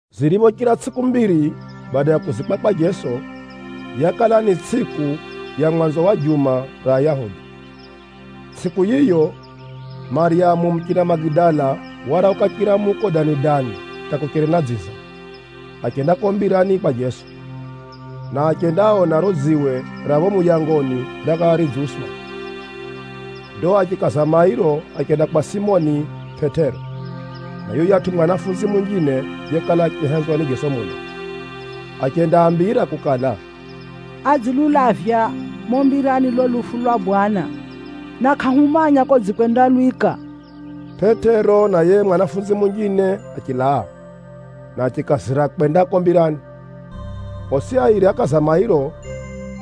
Ziriphochira tsʼiku mbiri bada ya kuzikwa kwa Jeso, yakala ni tsʼiku ya mwanzo wa juma ra Ayahudi. Tsʼiku ya mwanzo wa juma ra Ayahudi ni Jumapili. Tsʼiku yiyo, Maryamu muchina Magidala warauka chiramuko dani-dani hata kucheri na dziza, achenda kuko mbirani kwa Jeso, na achendaona riro dziwe ra phapho muyangoni rakala ridziuswa. Ndo achikaza mairo achenda kwa Simoni Pʼetero na yuyatʼu mwanafunzi munjine yekala achihenzwa ni Jeso muno. Achendaambira kukala, “Adzilulavya mumo mbirani lulo lufu lwa Bwana, na kʼahumanya kodzikwendalwika.” Pʼetero na yiye mwanafunzi munjine achilaa, na achikazira kwenda kuko mbirani. Osi airi ákaza mairo,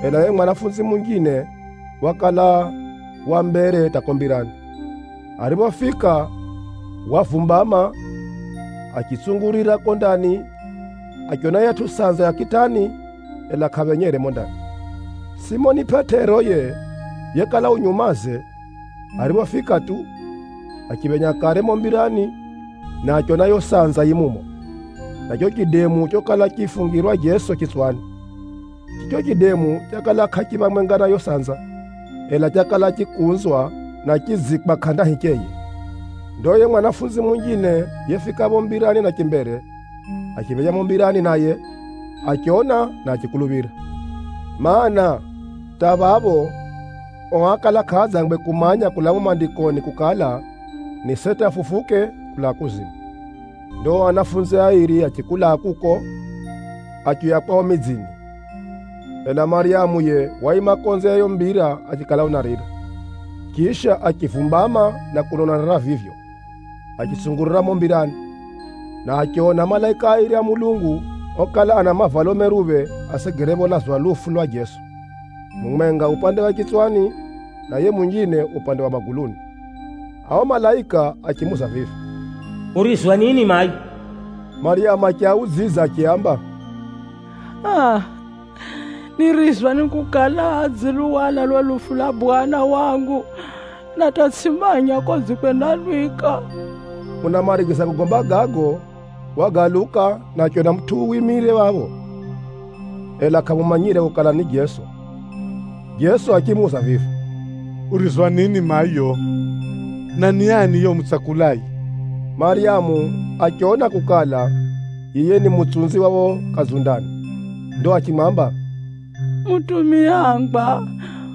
ela yiye mwanafunzi munjine wakala u mbere ya Pʼetero hata kuko mbirani. Ariphofika, wavumbama achitsungurira kuko ndani, achiona yiyatʼu sanza ya kitani, ela kʼaphenyere mumo ndani. Simoni Pʼetero yiye, yekala u nyumaze ariphofika tu, achiphenya kare mumo mbirani, na achiona yiyo sanza yi mumo, na chicho chidemu chokala chifungirwa Jeso chitswani. Chicho chidemu chakala kʼachi phamwenga na yiyo sanza, ela chakala chikunzwa, na chidziikwa kʼanda hicheye. Ndo yiye mwanafunzi munjine yefika phapho mbirani na chimbere, achiphenya mumo mbirani naye, achiona na achikuluphira. (Maana, hata phapho, ao ákala kʼaadzangwe kumanya kulaa mumo Maandikoni kukala, ni seti afufuke kulaa kuzimu.) Ndo ao anafunzi airi achikulaa kuko, achiuya kwao midzini. Ela Maryamu yiye waima konze ya yiyo mbira achikala unarira. Chisha, achivumbama na kuno unarira vivyo, achitsungurira mumo mbirani, na achiona malaika airi a Mulungu okala ana mavalo meruphe asegere pholazwa lufu lwa Jeso, mumwenga upande wa chitswani, na yiye munjine upande wa maguluni. Ao malaika achimuuza vivi, “Urizwa nini mayo?” Maryamu achiaudzidza achiaamba, “Aa, nirizwa ni kukala adziluhwala lufu lwa Bwana wangu, na hata tsʼimanya kodzikwendalwika.” Unamarigiza kugomba gago, wagaluka na achiona mutʼu wimire phapho, ela kʼamumanyire kukala ni Jeso. Jeso achimuuza vivi, “Urizwa nini mayo? Na ni ani yiye umutsakulaye?” Maryamu achiona kukala, yiye ni mutsunzi wa phapho kadzundani. Ndo achimwamba, “Mutumiangwa,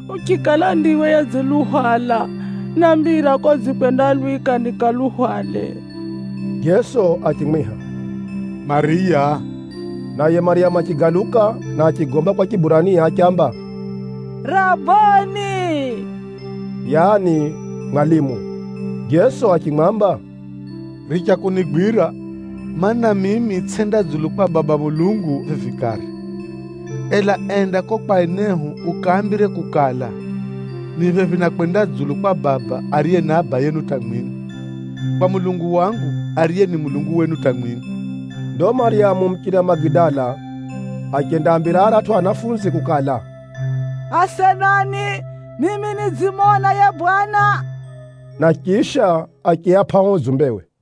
uchikala ndiwe yedziluhwala, nambira kodzikwendalwika nikaluhwale.” Jeso achimwiha, “Maryamu!” Naye Maryamu achigaluka, na achigomba kwa Chiburania achiamba, “Raboni!” yaani “Mwalimu!” Jeso achimwamba “Richa kunigwira, mana, mimi tsʼenda dzulu kwa Baba Mulungu vivi kare. Ela enda kuko kwa enehu ukaambire kukala, ‘Ni phephi na kwenda dzulu kwa Baba, ariye ni Abayenu hata mwimwi, kwa Mulungu wangu, ariye ni Mulungu wenu hata mwimwi.’” Ndo Maryamu muchina Magidala achendaambira aratʼu anafunzi kukala, “Asenani, mimi nidzimona yiye Bwana!” Na chisha achiapʼa uo udzumbewe.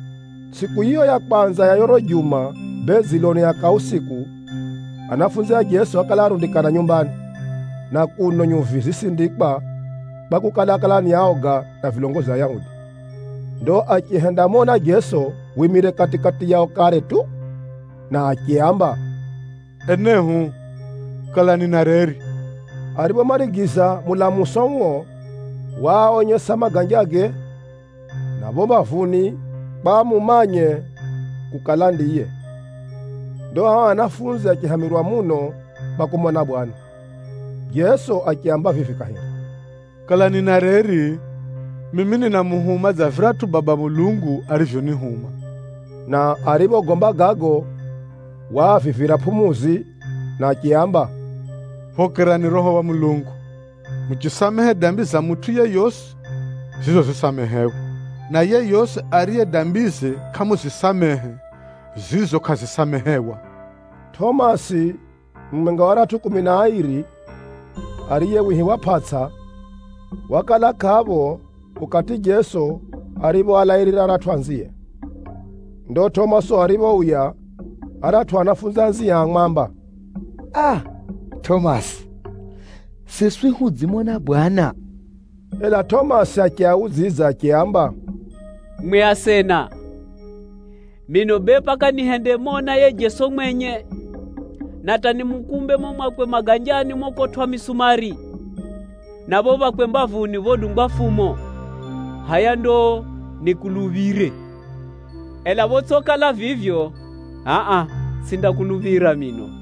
Tsʼiku yiyo ya kwanza ya riro juma bee dziloni ya kausiku, anafunzi a Jeso ákala arundikana nyumbani, na kuno nyuvi zisindikwa kwakukala, ákala ni aoga na vilongozi a Ayahudi. Ndo achihendamona Jeso wimire kati-kati yao kare tu, na achiaamba, “Enehu, kalani na reri!” Ariphomarigiza mulamuso uo, waaonyesa maganjage, na phapho mbavuni kwa amumanye kukala ndiye. Ndo ao anafunzi achihamirwa muno kwa kumona Bwana. Jeso achiaamba vivi kahiri, “Kalani na reri! Mimi ninamuhuma dza viratʼu Baba Mulungu arivyonihuma.” Na ariphogomba gago, waavivira pʼumuzi, na achiaamba, “Phokerani Roho wa Mulungu. Muchisamehe dambi za mutʼu yeyosi, zizo zisamehewa, na yeyosi ariye dambize kʼamuzisamehe, zizo kʼazisamehewa.” Tʼomasi, mumwenga wa aratʼu kumi na airi, (ariye wihiwa Pʼatsa), wakala kʼapho ukati Jeso ariphoalairira aratʼu anzie. Ndo Tʼomasi ariphouya, aratʼu anafunzi anzie ámwamba, “Aa! Tʼomasi, siswi hudzimona Bwana!” Ela Tʼomasi achiaudzidza achiaamba, “Mwi asena, mino bee paka nihendemona yiye Jeso mwenye, na hata nimukumbe mumo mwakwe maganjani mokotwʼa misumari, na phapho phakwe mbavuni phodungwa fumo, hʼaya ndo nikuluphire. Ela photsʼikala vivyo, hʼa-a tsʼindakuluphira mino.”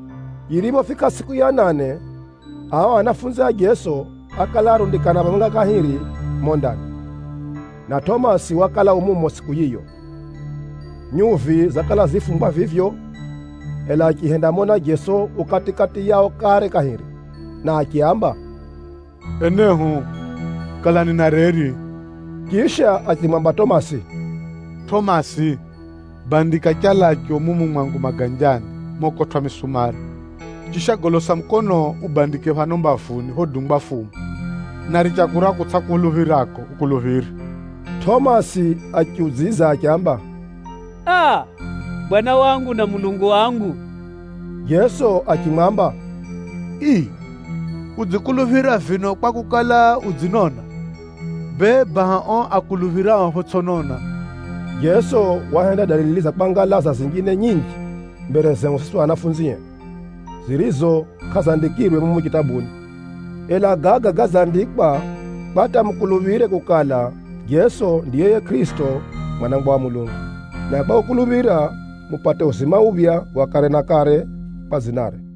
Yiriphofika tsʼiku ya nane, ao anafunzi a Jeso ákala arundikana phamwenga kahiri mumo ndani, na Tʼomasi wakala u mumo tsʼiku yiyo. Nyuvi zakala zifungwa vivyo, ela achihendamona Jeso u kati-kati yao kare kahiri, na achiaamba, “Enehu, kalani na reri!” Chisha achimwamba Tʼomasi, “Tʼomasi, bandika chalacho mumu mwangu maganjani mokotwʼa misumari, chisha golosa mukonoo ubandike phano mbavuni phodungwa fumo. Na richa kura kutsʼakuluphirako, ukuluphire!” Tʼomasi achiudzidza achiamba, “Aa! Bwana wangu na Mulungu wangu!” Jeso achimwamba, “Ii, udzikuluphira vino kwakukala, udzinona? Bee, baha ao akuluphirao photsʼi kona.” Jeso wahenda dalili za kwangalaza zinjine nyinji mbere zehu siswi anafunzie, zirizo kʼazandikirwe mumu chitabuni. Ela gaga gadzandikwa kwa hata mukuluphire kukala Jeso ndiye yiye Kʼirisito, Mwanangwa wa Mulungu, na kwa kukuluphira, mupate uzima uphya wa kare na kare kwa dzinare.